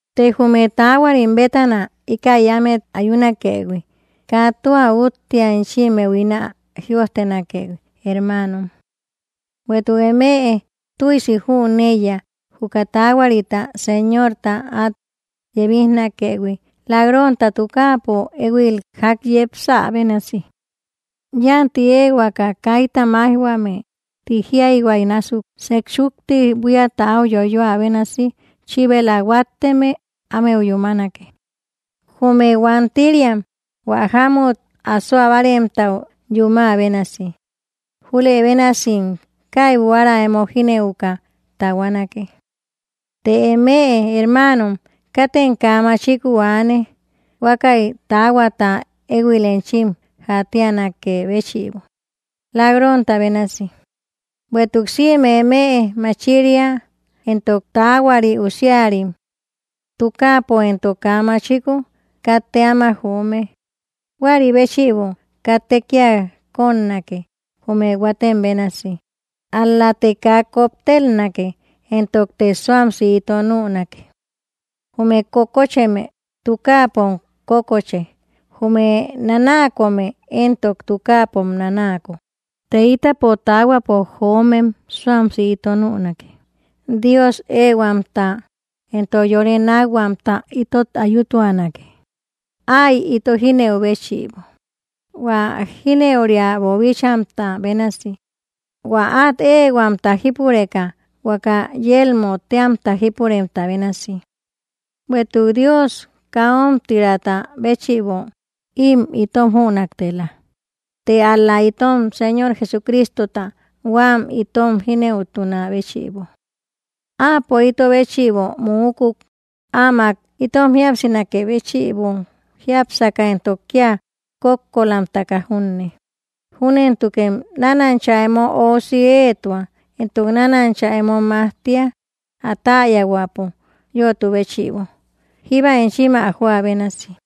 Të jume taahuarim bétana íkäi ámet ayunakëhui, kaa tua úttea enchimmeu ín ä jïojtenakëhui, hermaanom. Bueïtuk eme tüisi jüneiya, juka taahuarita Señorta át yebijnakëhui, lak-ronta tukaapo éhuil ják yepsä bénasi. “Yánti éehuaka, kaita máijhuame”, ti jíayhua násuk, sejchúkti buíata áu yoyoä bénasi chíbela huátteme ámeu yúmanake, jume huantiriam hua jámut asoa báaremtau yumä bénasi; júlëbénasim kaibu ára emo jínëuka tahuanake. Të eme, hermaanom, katem kaa machikuu aane, huákäi taahuata éhuil enchim jaatianakë béchïbo, lak-ronta bénasi. Bueïtuk sïme eme machiria entok taahuari usiarim. Tukaapo entok kaa machikuu, katte áma joome. Huäri béchïbo, katte kía kónnake, jume huatem bénasi, ál‑late kaa koptelnake entokte suamsi ito nünake. Jume kókocheme tukaapom kókoche; jume nanaakome éntok tukaapom nanaako. Të ítapo taahuapo joomem suamsi ito nünake, Dios éehuamta entok yore nákhuamta itot ayutuanake, áy ito jínëu béchïbo, hua jínëuria boobíchaïhuimta bénasi, hua át éehuamta jípureka, huaka yelmö téamta jípuremta bénasi. Bueïtuk Dios kaa ómtiraata béchïbo ím itom jünaktela, të ál‑la itom Señor Jesucristota huám itom jínëutunä béchïbo. Áapo ito béchïbo muukuk, áamak itom jíapsinakë béchïbo, jiápsaka entok kía kókkolamtaka junne. Júntukem nánancha emo óusi éetua entok nánancha emo majtia, ä täyahuäpo yötu béchïbo, jíba enchim ä joä bénasi.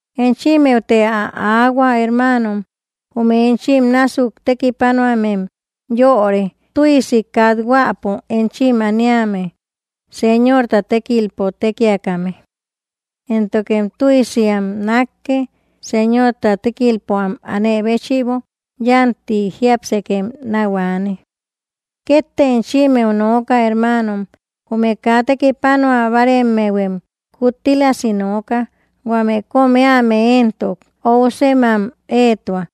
Enchimmeute ä aahua, hermaanom, jume enchim násuk tekipanuamem yöre, tüisi kathuäpo enchim aniame, Señorta tékilpo tékiakame. Éntokem tüisi am nákke, Señorta tékilpo am anë béchïbo. Yánti jiápsekem náu aane. Kétte enchimmeu nooka, hermaanom: jume kaa tekipanua báaremmehuem kuttílasi nooka; huame kóm éame éntok, ousem am éetua;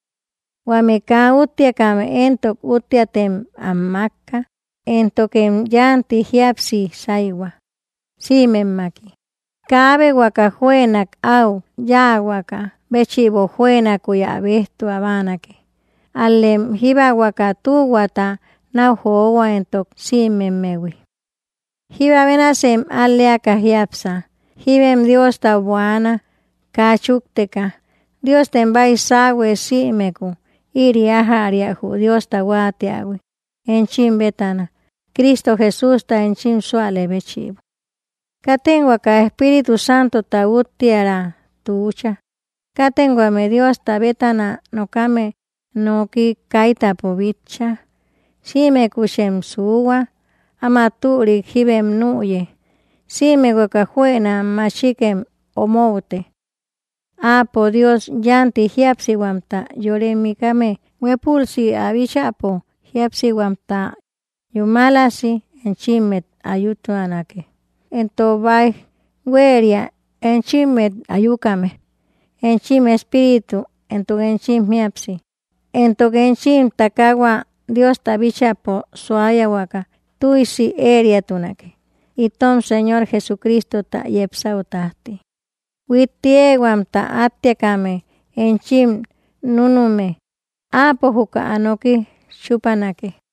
huame kaa útteakame éntok, útteatem am mákka; éntokem yánti jíapsi sáyhua, sïmemmaki. Kaabe huaka juënak au yáahuaka béchïbo juënakuy ä béjtua báanake; ál‑lem jíba huaka tühuata náu johua, entok sïmemmehui. Jíba bénasem al‑leaka jiápsa. Jíbem Diostau buaana, kaa chúkteka. Diostem baisauhue sïmekuu; ïri ájäria jü Diosta huáatiähui enchim bétana, Cristo Jesústa enchim súalë béchïbo. Katem huaka Espíritu Santota úttiäraa tuucha. Katem huame Diosta bétana nokame nooki kaitäpo bitcha. Sïmekuchem suuhua; áma türik jíbem nüye. Sïme huaka juëna machikem omoute. Áapo Dios yánti jíapsihuamta yore mikame, huépülsi ä bíchäpo jíapsihuamta yúmalasi enchimmet ayutuanake; entok báij huéria enchimmet ayukame: enchim espíritu, entok enchim jíapsi, entok enchim takaahua Diosta bíchäpo suayahuaka tüisi ëeriatunake, itom Señor Jesucristota yepsäu tájti. Huitti éehuamta áttiakame enchim núnume; Áapo juka ä noki chúpanake.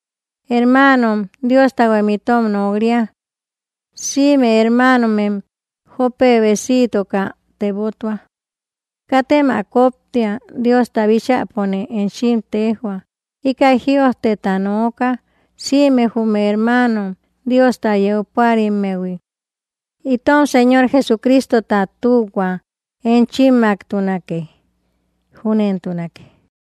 Hermaanom, Diostahuem itom nok‑ria. Sïme hermaanomem jópe besiitoka tebotua. Katem ä kóptia: Diosta bíchäpone enchim téjhua, íkäi jïojteta nooka, sïme jume hermaano Diosta yeu púarimmehui. Itom Señor Jesucristota tühua enchimmaktunake. Júnentunake.